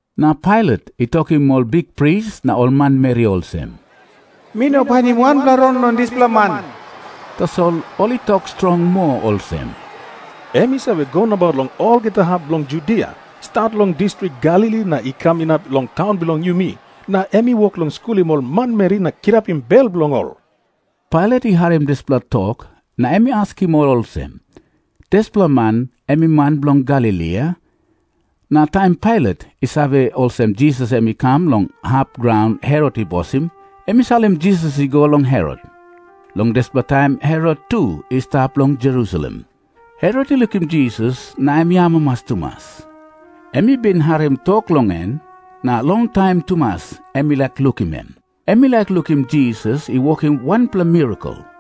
Na Pailat i tokim ol bikpris na ol manmeri olsem, “Mi no painim wanpela rong long dispela man.” Tasol ol i tok strong moa olsem, “Em i save go nabaut long olgeta hap bilong Judia, stat long distrik Galili na i kam inap long taun bilong yumi, na em i wok long skulim ol manmeri na kirapim bel bilong ol.” Pailat i harim dispela tok na em i askim ol olsem, “Dispela man em i man bilong Galili, a?” Na taim Pailat i save olsem Jisas em i kam long hap graun Herot i bosim, em i salim Jisas i go long Herot. Long dispela taim Herot tu i stap long Jerusalem. Herot i lukim Jisas, na em i amamas tumas. Em i bin harim tok long em, na longtaim tumas em i laik lukim em. Em i laik lukim Jisas i wokim wanpela mirakel.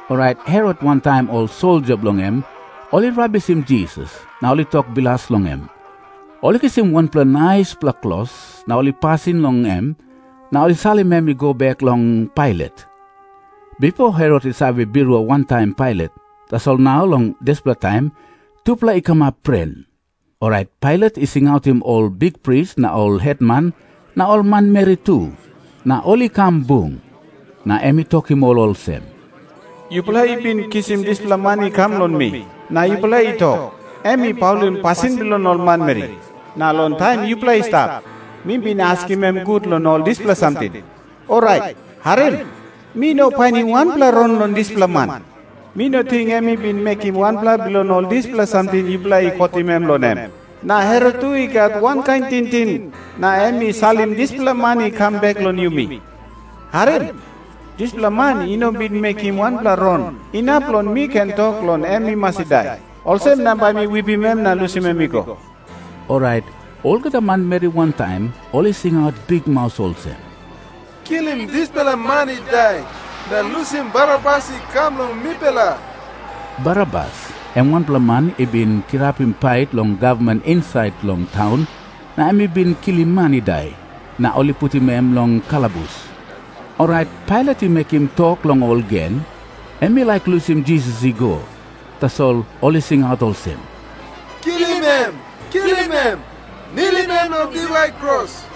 Orait Herot wantaim ol soldia bilong en ol i rabisim Jisas, na ol i tok bilas long em. Ol i kisim wanpela naispela klos, na ol i pasim long em, na ol i salim em i go bek long Pailat. Bipo Herot i save birua wantaim Pailat. Tasol nau long dispela taim tupela i kamap pren. Orait Pailat i singautim ol bikpris na ol hetman na ol manmeri tu, na ol i kam bung. Na em i tokim ol olsem, “Yupela i bin kisim dispela man i kam long mi, na yupela i tok, em i paulim pasin bilong ol manmeri. Na long taim yupela i stap, mi bin askim em gut long ol dispela samting. Orait harim. Mi no painim wanpela rong long dispela man. Mi no ting em i bin mekim wanpela bilong ol dispela samting yupela i kotim em long en. Na Herot tu i gat wankain tingting, na em i salim dispela man i kam bek long yumi. Harim. Dispela man i no bin mekim wanpela rong inap long mi ken tok long em i mas i dai. Olsem na bai mi wipim em na lusim em i go.” Orait olgeta manmeri wantaim, ol i singaut bikmaus olsem, “Kilim dispela man i dai, na lusim Barabas i kam long mipela.” Barabas em wanpela man i bin kirapim pait long gavman insait long taun, na em i bin kilim man i dai, na ol i putim em long kalabus. Orait Pailat i mekim tok long ol gen. Em i laik lusim Jisas i go. Tasol ol i singaut olsem, “Kilim em! Kilim em! Nilim em long diwai kros!”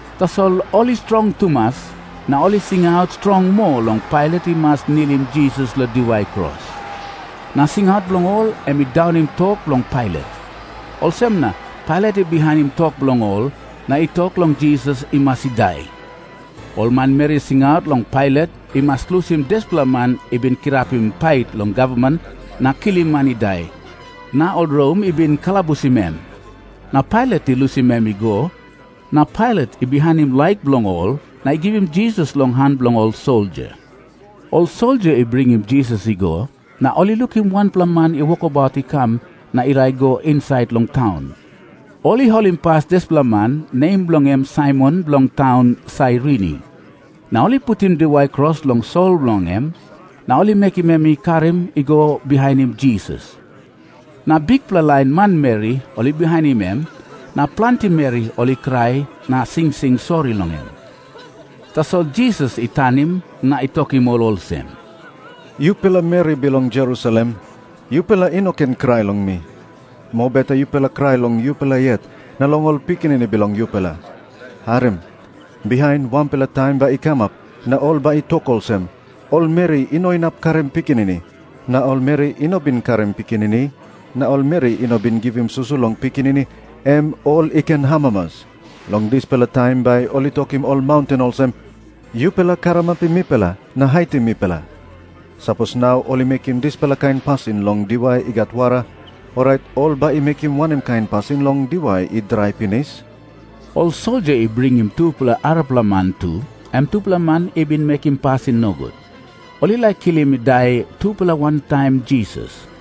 Tasol ol i strong tumas, na ol i singaut strong moa long Pailat i mas nilim Jisas long diwai kros. Na singaut bilong ol em i daunim tok bilong Pailat. Olsem na Pailat i bihainim tok bilong ol, na i tok long Jisas i mas i dai. Ol manmeri i singaut long Pailat i mas lusim dispela man i bin kirapim pait long gavman na kilim man i dai, na ol Rom i bin kalabusim em. Na Pailat i lusim em i go. Na Pailat i bihainim laik bilong ol na i givim Jisas long han bilong ol soldia. Ol soldia i bringim Jisas i go, na ol i lukim wanpela man i wokabaut i kam na i laik i go insait long taun. Ol i holimpas dispela man, nem bilong en Saimon bilong taun Sairini. Na ol i putim diwai kros long sol bilong en, na ol i mekim em i karim i go bihainim Jisas. Na bikpela lain manmeri ol i bihainim em, na planti meri ol i krai na singsing sori long em. Tasol Jisas i tanim na i tokim ol olsem, “Yupela meri bilong Jerusalem, yupela i no ken krai long mi. Mobeta yupela i krai long yupela yet na long ol pikinini bilong yupela. Harim. Bihain wanpela taim bai i kamap na ol bai i tok olsem, ‘Ol meri i no inap karim pikinini, na ol meri i no bin karim pikinini, na ol meri i no bin givim susu long pikinini, em ol i ken amamas.’ Long dispela taim bai ol i tokim ol maunten olsem, ‘Yupela karamapim mipela na haitim mipela.’ Sapos nau ol i mekim dispela kain pasin long diwai i gat wara, orait ol bai i mekim wanem kain pasin long diwai i drai pinis?” Ol soldia i bringim tupela arapela man tu, em tupela man i bin mekim pasin nogut. Ol i laik kilim i dai tupela wantaim Jisas.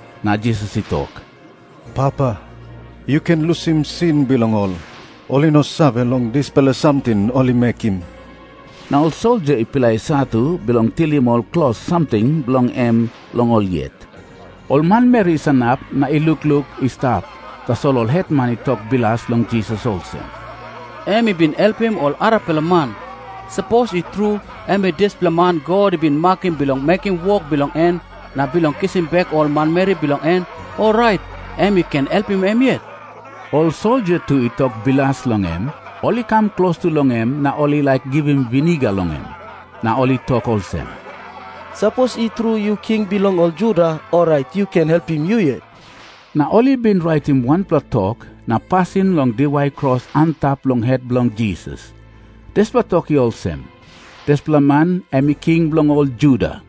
Na Jisas i tok, “Papa, yu ken lusim sin bilong ol. Ol i no save long dispela samting ol i mekim.” Na ol soldia i pilai satu bilong tilim ol klos samting bilong em long ol yet. Ol manmeri i sanap na i lukluk i stap, tasol ol hetman i tok bilas long Jisas olsem, “Em i bin helpim ol arapela man. Sapos i tru em i dispela man God i bin makim bilong mekim wok bilong en na bilong kisim bek ol manmeri bilong en, orait em i ken helpim em yet.” Ol soldia tu i tok bilas long em. Ol i kam klostu long em na ol i laik givim viniga long em. Na ol i tok olsem, “Sapos i tru yu king bilong ol Juda, orait yu ken helpim yu yet.” Na ol i bin raitim wanpela tok na pasim long diwai kros antap long het bilong Jisas. Dispela tok i olsem, “Dispela man em i King bilong ol Juda.”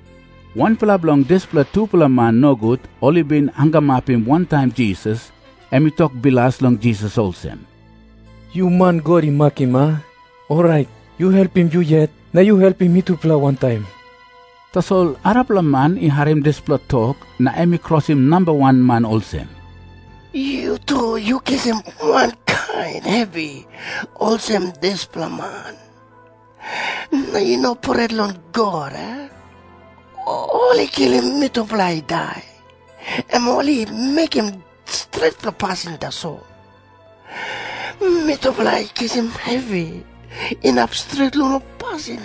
Wanpela bilong dispela tupela man nogut ol i bin hangamapim wantaim Jisas, em i tok bilas long Jisas olsem, “Yu man God i makim, a? Orait yu helpim yu yet, na yu helpim mitupela wantaim.” Tasol arapela man i harim dispela tok na em i krosim namba wan man olsem, “Yu tu yu kisim wankain hevi olsem dispela man, na yu no pret long God, a? Ol i kilim mitupela i dai, em ol i mekim stretpela pasin tasol. Mitupela i kisim hevi inap stret long ol pasin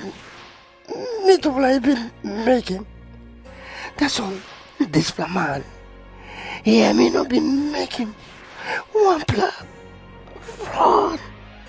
mitupela i bin mekim. Tasol dispela man hia em i no bin mekim wanpela rong.”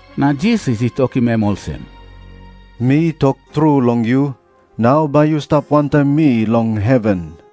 Na Jisas i tokim em olsem, “Mi tok tru long yu, nau bai yu stap wantaim mi long heven.”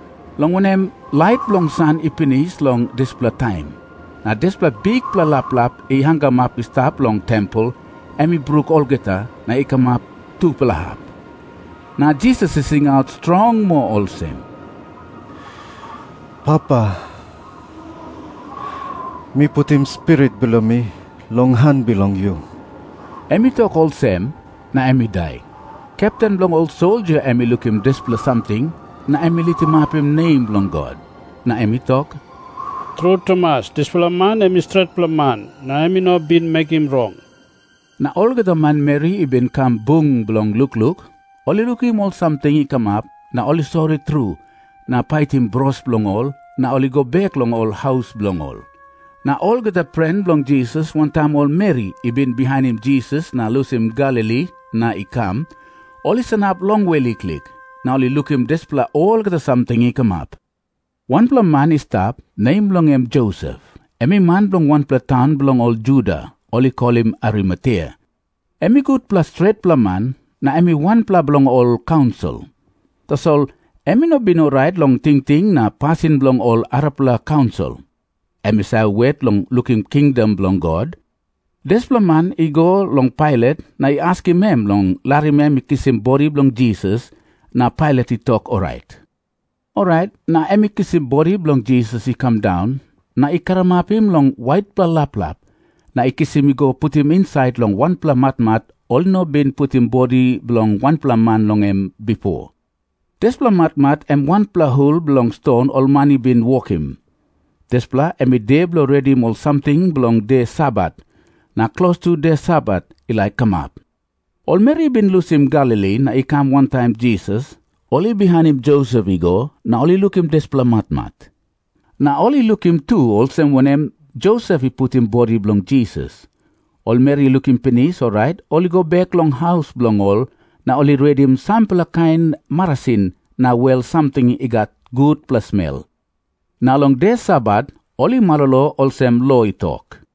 long wanem, lait bilong san i pinis long dispela taim. Na dispela bikpela laplap i hangamap i stap long tempel, em i bruk olgeta, na i kamap tupela hap. Na Jisas i singaut strong moa olsem, “Papa, mi putim spirit bilong mi long han bilong yu.” Em i tok olsem, na em i dai. Kepten bilong ol soldia em i lukim dispela samting, na em i litimapim nem bilong God. Na em i tok, “Tru tumas, dispela man em i stretpela man, na em i no bin mekim rong.” Na olgeta manmeri i bin kam bung bilong lukluk, ol i lukim ol samting i kamap, na ol i sori tru na paitim bros bilong ol, na ol i go bek long ol haus bilong ol. Na olgeta pren bilong Jisas, wantaim ol meri i bin bihainim Jisas na lusim Galili na i kam, ol i sanap longwe liklik, na ol i lukim dispela olgeta samting i kamap. Wanpela man i stap, nem bilong en Josep. Em i man bilong wanpela taun bilong ol Juda, ol i kolim Arimatea. Em i gutpela stretpela man, na em i wanpela bilong ol kaunsil. Tasol em i no bin orait long tingting na pasin bilong ol arapela kaunsil. Em i save wet long lukim kingdom bilong God. Dispela man i go long Pailat na i askim em long larim em i kisim bodi bilong Jisas, na Pailat i tok orait. Orait na em i kisim bodi bilong Jisas i kam daun, na i karamapim long waitpela laplap, na i kisim i go putim insait long wanpela matmat ol i no bin putim bodi bilong wanpela man long en bipo. Dispela matmat em wanpela hul bilong ston ol man i bin wokim. Dispela em i de bilong redim ol samting bilong de Sabat, na klostu de Sabat i laik kamap. Ol meri i bin lusim Galili na i kam wantaim Jisas, ol i bihainim Josep i go na ol i lukim dispela matmat. Na ol i lukim tu olsem wanem Josep i putim bodi bilong Jisas. Ol meri i lukim pinis, orait ol i go bek long haus bilong ol na ol i redim sampela kain marasin na wel samting i gat gutpela smel. Na long de Sabat ol i malolo olsem lo i tok.